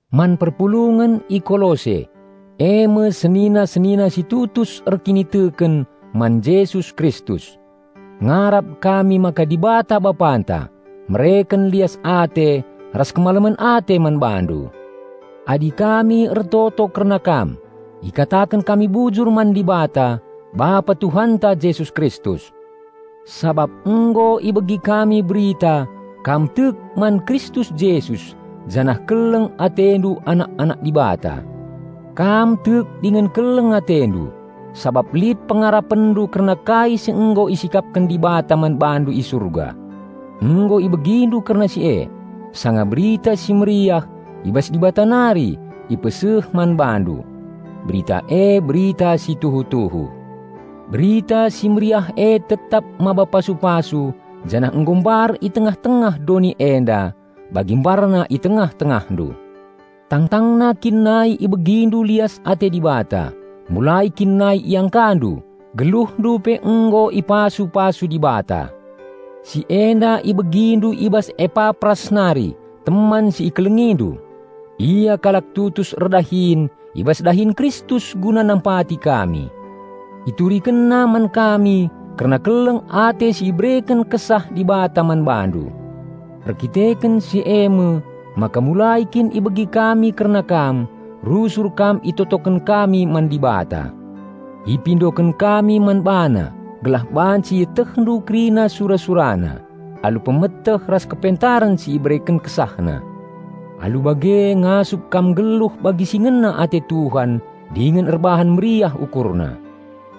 Man perpulungen i Kolose: e me senina-senina si tutus erkiniteken man Jesus Kristus. Ngarap kami maka Dibata Bapanta, mereken lias ate ras kemalemen ate man bandu. Adi kami ertoto kerna kam, ikataken kami bujur man Dibata, Bapa Tuhanta Jesus Kristus, sabap nggo ibegi kami berita kam tek man Kristus Jesus janah keleng atendu anak-anak Dibata. Kam tek dingen keleng atendu, sabap lit pengarapenndu kerna kai si nggo isikapken Dibata man bandu i Surga. Nggo ibegindu kerna si e, sanga Berita Si Mehuli i bas Dibata nari ipeseh man bandu. Berita e berita si tuhu-tuhu. Berita Si Mehuli e tetap maba pasu-pasu janah nggo mbar i tengah-tengah doni enda, bagi mbarna i tengah-tengahndu. Tangtangna kin nai ibegindu lias ate Dibata, mulai kin nai iangkandu, geluhndu pe nggo ipasu-pasu Dibata. Si enda ibegindu i bas Epapras nari teman si ikelengindu. Ia kalak tutus erdahin i bas dahin Kristus guna nampati kami. Iturikenna man kami kerna keleng ate si ibereken Kesah Dibata man bandu. Erdandanken si e me, maka mulai kin ibegi kami kerna kam, rusur kam itotoken kami man Dibata. Ipindoken kami man BaNa gelah banci ietehndu kerina sura-SuraNa, alu pemeteh ras kepentaren si ibereken KesahNa. Alu bage ngasup kam nggeluh bagi si ngena ate Tuhan dingen erbahan meriah UkurNa.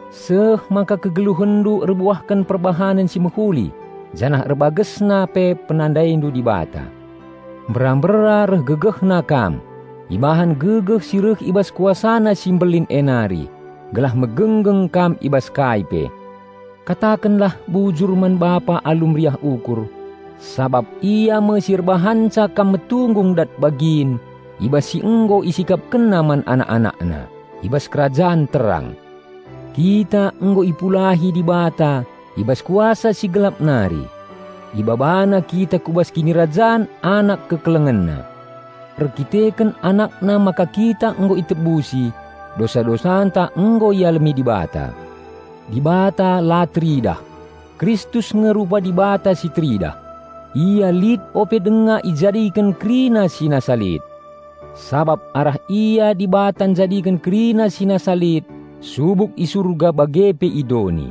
Seh maka kegeluhenndu erbuahken perbahanen si mehuli, janah erbagesna pe penandaindu Dibata. Mbera-mbera reh gegehna kam ibahan gegeh si reh i bas KuasaNa si mbelin e nari, gelah megenggeng kam i bas kai pe. Katakenlah bujur man Bapa alu meriah ukur, sabap Ia me si erbahanca kam metunggung dat bagin i bas si nggo IsikapkenNa man anak-AnakNa, i bas Kerajan Terang. Kita nggo ipulahi Dibata i bas kuasa si gelap nari. IbabaNa kita ku bas Kinirajan Anak KekelengenNa. Erdandanken AnakNa maka kita nggo itebusi, dosa-dosanta nggo ialemi Dibata. Dibata la teridah, Kristus nge rupa Dibata si teridah. Ia lit ope denga ijadiken kerina si nasa lit. Sabap arah Ia Dibata njadiken kerina si nasa lit subuk i Surga bage pe i doni,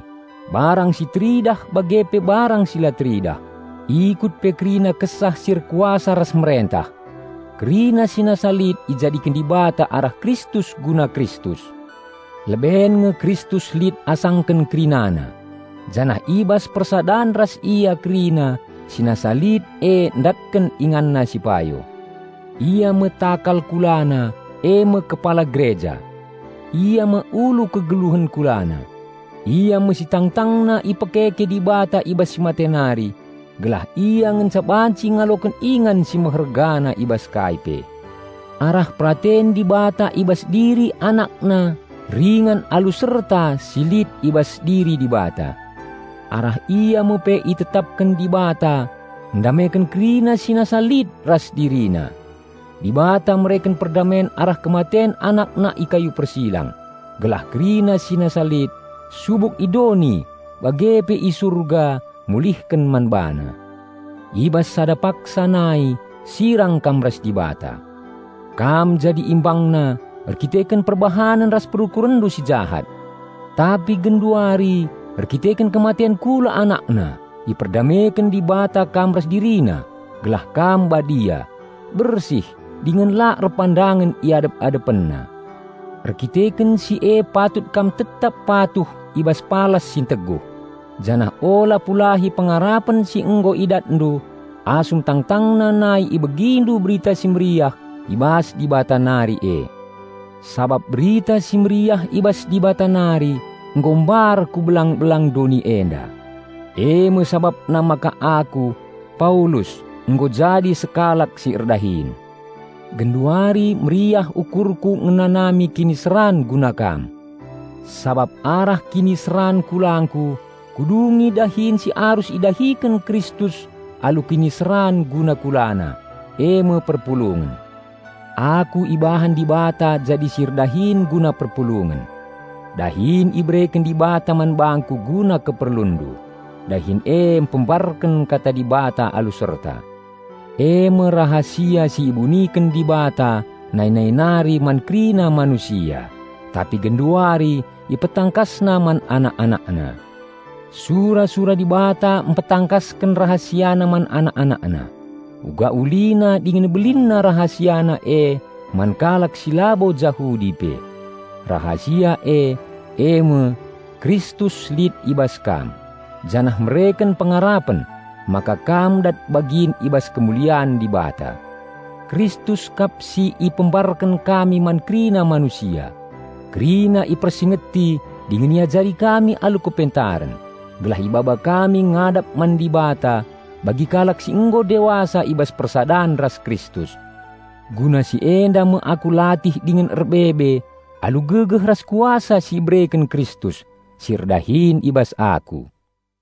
barang si teridah bage pe barang si la teridah, ikut pe kerina kesah si erkuasa ras merentah. Kerina si nasa lit ijadiken Dibata arah Kristus guna Kristus. Leben nge Kristus lit asangken kerinana, janah i bas persadan ras Ia kerina si nasa lit e ndatken inganna si payo. Ia me takal KulaNa, e me kepala Gereja. Ia me ulu kegeluhen KulaNa. Ia me si tangtangna ipekeke Dibata i bas si mate nari gelah Ia ngenca banci ngaloken ingan si mehergana i bas kai pe. Arah peraten Dibata i bas diri AnakNa ringan alu serta si lit i bas diri Dibata. Arah Ia me pe itetapken Dibata ndameken kerina si nasa lit ras DiriNa. Dibata mereken perdamen arah kematen AnakNa i kayu persilang, gelah kerina si nasa lit, subuk i doni bage pe i Surga mulihken man BaNa. I bas sada paksa nai, sirang kam ras Dibata. Kam jadi ImbangNa erdandanken perbahanen ras perukurenndu si jahat. Tapi genduari, erdandanken kematen kula AnakNa, iperdameken Dibata kam ras DiriNa, gelah kam badia, bersih dingen la erpandangen i adep-AdepenNa. Erdandanken si e patut kam tetap patuh i bas palas si nteguh, janah ula pulahi pengarapen si nggo idatndu asum tangtangna nai ibegindu Berita Si Mehuli i bas Dibata nari e. Sabap Berita Si Mehuli i bas Dibata nari nggo mbar ku belang-belang doni enda. E me sabapna maka aku, Paulus nggo jadi sekalak si erdahin. Genduari meriah ukurku ngenanami kiniseran guna kam. Sabap arah kiniseran kulangku, kudungi dahin si arus idahiken Kristus alu kiniseran guna KulaNa, e me perpulungen. Aku ibahan Dibata jadi si erdahin guna perpulungen. Dahin ibereken Dibata man bangku guna keperlunndu. Dahin e mpembarken kata Dibata alu serta, e me rahasia si ibuniken Dibata nai-nai nari man kerina manusia, tapi genduari IpetangkasNa man anak-AnakNa. Sura-sura Dibata mpetangkasken RahasiaNa man anak-AnakNa, uga ulina dingen belinna RahasiaNa e man kalak si labo Jahudi pe. Rahasia e, e me: Kristus lit i bas kam, janah mereken pengarapen maka kam dat bagin i bas kemulian Dibata. Kristus kap si ipembarken kami man kerina manusia. Kerina ipersingeti dingen iajari kami alu kepentaren, gelah ibaba kami ngadap man Dibata bagi kalak si nggo dewasa i bas persadan ras Kristus. Guna si enda me aku latih dingen erbebe alu gegeh ras kuasa si ibereken Kristus, si erdahin i bas aku.